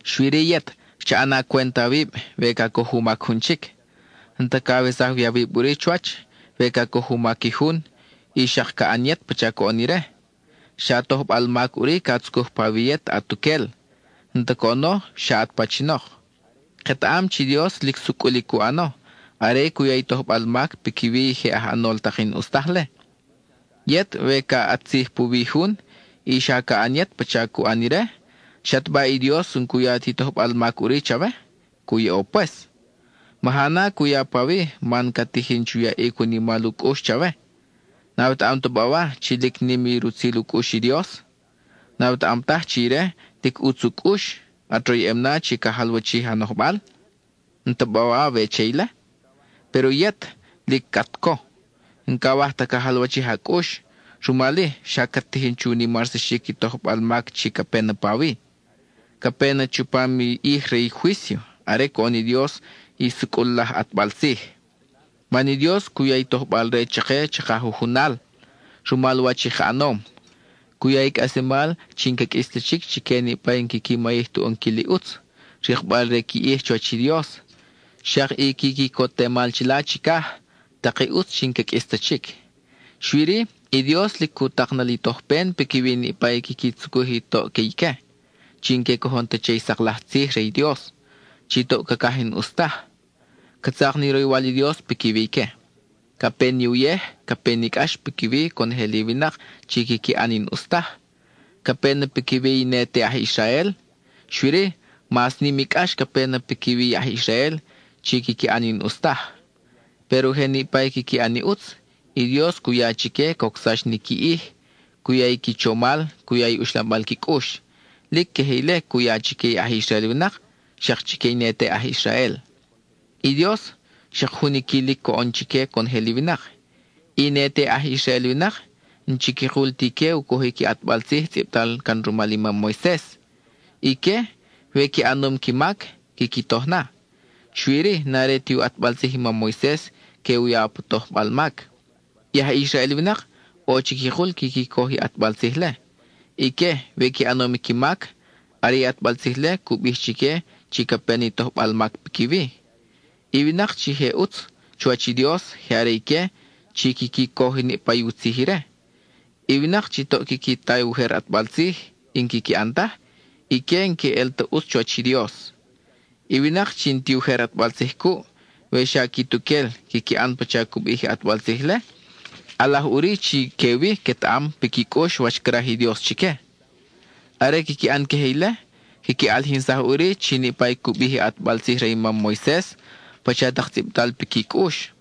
Xui-ri, yet cha ʼana cwent awib we ca coj u mac jun chic. N-ta cawesaj wi awib ʼuri chuwach we ca coj u mac i jun, y xak ca ʼan yet pacha coʼon ire. Xa tojbal mac ʼuri ca tzucuj pawi yet atuquel, n-ta coʼono xa at pachinok. Ketaʼam chi Dios lic sucʼul i cu ʼano are cu ya i tojbal mac piquiwi i je aj ʼanol tak i n-ʼus taj-le. Yet we ca ʼat tzij puwi i jun, y xa ca ʼan yet pacha cu ʼan ire, ¿xataba i Dios n-cu ya ti tojbal mac ʼuri chawe? Cu yaʼo pues. Maja na cu ya pawi man ca tijin chu yaʼic u nimal u cʼux chawe. ¿N-awetaʼam ta bawa chi lic nim i rutzil u cʼux i Dios? ¿N-awetaʼam taj chi ire, lic ʼutz u cʼux, at royʼem na chi ca jalwachij a nojbal? ¿N-ta bawa awe che ile? Péro yet, lic at co, n-cawaj ta ca jalwachij a cʼux; rumal-i, xa cat tijin chu nimarsaxic i tojbal a mac chi ca pe na pawi. Ca pe na chupam i ʼij re i juício, are coʼon i Dios i sucʼul laj ʼatbal tzij. Man i Dios cu ya i tojbal-re chake chaka jujunal, rumal wach i ka ʼanom. Cu ya i cʼaslemal chi n-ca qʼuis ta chic chique niʼpa i n-quiqui mayij tu ʼonquil i ʼutz, rikbal re qui ʼij chuwach i Dios, xak i qui quicotemal chila chicaj, tak i ʼutz chi n-ca qʼuis ta chic. Xui-ri, i Dios lic cu tak na li tojpen piquiwi niʼpa i quiqui tzucuj i toʼ que ique, chi n-que cojon ta che i sak laj tzij re i Dios, chi toʼ cacaj i n-ʼus taj. Ca tzak ni roywal i Dios piquiwi ique. Ca pe ni uyej, ca pe ni cʼax piquiwi conojel i winak chi quiqui ʼan i n-ʼus taj; ca pe na piquiwi i ne te aj Israel, xui-ri, mas nim i cʼax ca pe na piquiwi i aj Israel chi quiqui ʼan i n-ʼus taj. Péro je niʼpa i quiqui ʼan i ʼutz, i Dios cu ya chique cocsax ni qui ʼij; cu ya i qui chomal, cu ya i uxlambal qui cʼux. Lic queje ile cu ya chique i aj Israel winak, xak chique i ne te aj Israel. I Dios, xak jun i quilic coʼon chique conojel i winak. I ne te aj Israel winak n-chiquikul ti ique u cojic i ʼatbal tzij tzʼibtal can rumal i mam Moises. Ique, we qui ʼanom qui mac, quiqui toj na, xui-ri n-are ti u ʼatbal tzij i mam Moises que u ya pa tojbal mac. I aj Israel winak ʼo chiquikul quiqui coj i ʼatbal tzij-le. Ique, we qui ʼanom qui mac, are i ʼatbal tzij-le cu bij chique chi ca pe ni tojbal mac piquiwi. I winak chi je ʼutz chuwach i Dios je are ique chi quiqui coj niʼpa u tzij ire. I winak chi toʼ quiqui ta i ujer ʼatbal tzij, y n-quiqui ʼan taj, ique n-que ʼel ta ʼutz chuwach i Dios. I winak chi n-ti ujer ʼatbal tzij cuʼ, we xa quituquel quiqui ʼan pacha cu bij i ʼatbal tzij-le, ʼalaj ʼuri chi que-wi quetaʼam piqui cʼux wach craj i Dios chique. Are quiqui ʼan queje ile, quiqui ʼalijinsaj ʼuri chi niʼpa i cu bij i ʼatbal tzij re i mam Moises, pacha tak tzʼibtal piqui cʼux.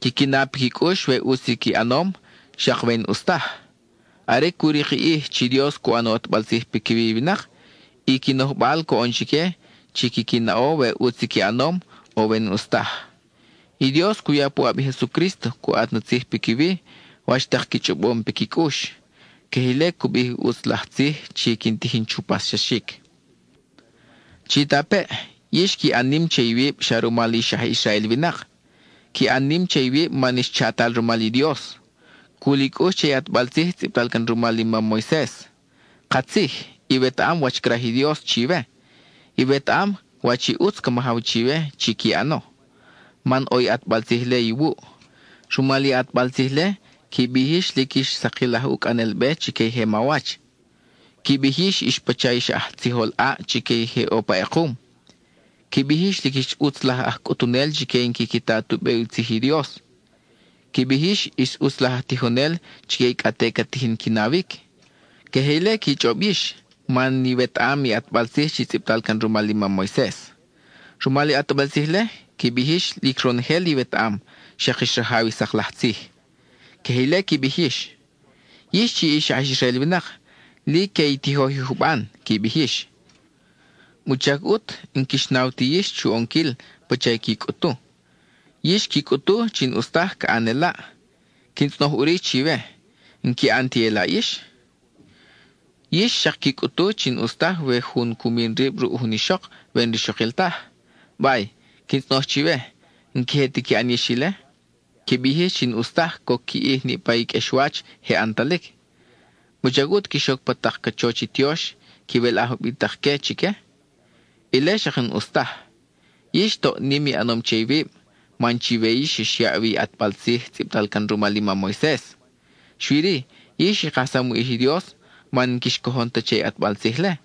Quiqui na piqui cʼux we ʼutz i qui ʼanom, xak we n-ʼus taj. Are cu rik i ʼij chi Dios cu ʼan u ʼatbal tzij piquiwi i winak, i qui nojbal coʼon chique chi quiqui naʼo we ʼutz i qui ʼanom, o we n-ʼus taj. I Dios cu ya puʼab i Jesucrísto cu ʼat na tzij piquiwi, wach tak qui chʼobom piqui cʼux. Queje ile cu bij i ʼutz laj tzij chi quin tijin chu paxsaxic. Chitapeʼ; yix qui ʼan nim che iwib xa rumal ix aj Israel winak. Qui ʼan nim che iwib man ix chatal rumal i Dios; cul i cʼux che i ʼatbal tzij tzʼibtal can rumal i mam Moises. Katzij, iwetaʼam wach craj i Dios chiwe; iwetaʼam wach i ʼutz ca majaw chiwe chi qui ʼano, man ʼo i ʼatbal tzij-le iwuʼ. Rumal i ʼatbal tzij-le, qui bij yix lic ix sakil aj ucʼanel-be chique i je mawach; qui bij yix ix pacha ix aj tzijol ʼaʼ chique i je ʼo pa ʼekum. Qui bij yix lic ix ʼutz laj aj cʼutunel chique i n-quiqui ta tu be u tzij i Dios; qui bij yix ix ʼutz laj aj tijonel chique i cʼa te ca tijin qui nawic. Queje ile qui chʼob yix, man iwetaʼam i ʼatbal tzij chi tzʼibtal can rumal i mam Moises. Rumal i ʼatbal tzij-le, qui bij yix lic ronojel iwetaʼam, xak ix rajaw i sak laj tzij. (Queje ile qui bij yix.) Yix chi ix aj Israel winak, lic que i tijoj i juban, qui bij yix. ¿Wuchac ʼut n-quix naw ti yix chu ʼonquil pacha i qui cʼutu? Yix qui cʼutu chi n-ʼus taj ca ʼan elaʼ; quin tzʼonoj ʼuri chiwe ¿n-qui ʼan ti elaʼ yix? Yix xak qui cʼutu chi n-ʼus taj we jun cu min rib ruʼ jun ixok we n-rixokil taj. Bay, quin tzʼonoj chiwe ¿n-queje ti qui ʼan yix ile? Qui bij yix chi n-ʼus taj coc qui ʼij niʼpa i qʼuexwach je ʼantalic, ¿wuchac ʼut quix oc pa tak cachoch tiox y quiwelʼaj ubitak-que chique? Ile xak n-ʼus taj. Yix toʼ nim i ʼanom che iwib, man chiwe yix xyaʼ wi i ʼatbal tzij tzʼibtal can rumal i mam Moises. Xui-ri, yix i kajsam u ʼij i Dios man n-quix cojon ta che i u ʼatbal tzij-le.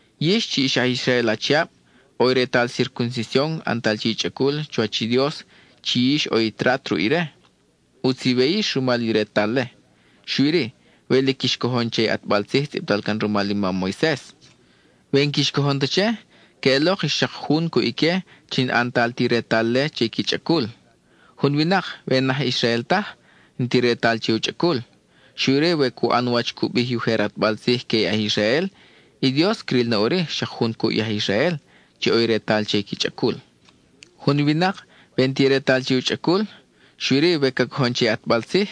Yix chi ix aj Israel achiab, ʼo i retal circuncision ʼantal che i chʼacul chuwach i Dios chi yix ʼo i trat ruʼ ire. ʼUtz iwe yix rumal i retal-le, xui-ri, we lic quix cojon che i ʼatbal tzij tzʼibtal can rumal i mam Moises. We n-quix cojon ta che, queʼelok ix xak jun cuʼ ique chi n-ʼantal ti retal-le che qui chʼacul. Jun winak, we n-aj Israel taj, n-ti retal che u chʼacul, xui-ri we cu ʼan wach cu bij i ujer ʼatbal tzij que i aj Israel, i Dios cril na ʼuri xak jun cuʼ i aj Israel, chi ʼo i retal che i qui chʼacul. Jun winak, we n-ti retal-le che u chʼacul, xui-ri we ca cojon che i ʼatbal tzij,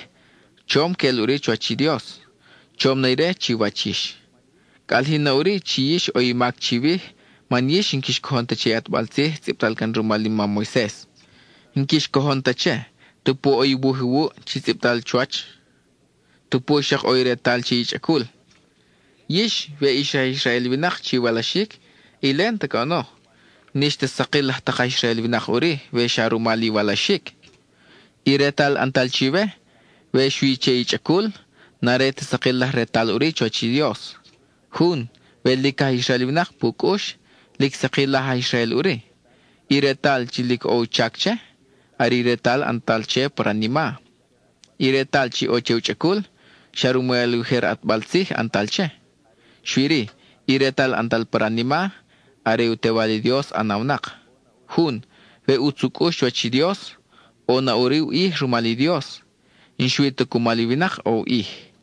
chom queʼel ʼuri chuwach i Dios, chom na ire chiwach yix. Ca ʼalijin na ʼuri chi yix ʼo i mac chiwij, man yix n-quix cojon ta che i ʼatbal tzij tzʼibtal can rumal i mam Moises. N-quix cojon ta che, tupu ʼo i wuj iwuʼ chi tzʼibtal chuwach, tupu xak ʼo retal che i chʼacul. Yix, we ix aj Israel winak chi iwalaxic, ile n-ta coʼono, n-ix ta sakil laj tak aj Israel winak ʼuri we xa rumal iwalaxic. I retal ʼantal chiwe, we xui che i chʼacul, n-are ta sakil laj retal ʼuri chuwach i Dios. Jun, we lic aj Israel winak pu cʼux, lic sakil laj aj Israel ʼuri. I retal chi lic ʼo u chac che, are i retal ʼantal che pa ranima. I retal chi ʼo che u chʼacul, xa rumal i ujer ʼatbal tzij ʼantal che; xui-ri, i retal ʼantal pa ranima, are u Tewal i Dios ʼanawnak. Jun, we ʼutz u cʼux chuwach i Dios, ʼo na ʼuri u ʼij rumal i Dios, n-xui ta cumal i winak ʼo u ʼij.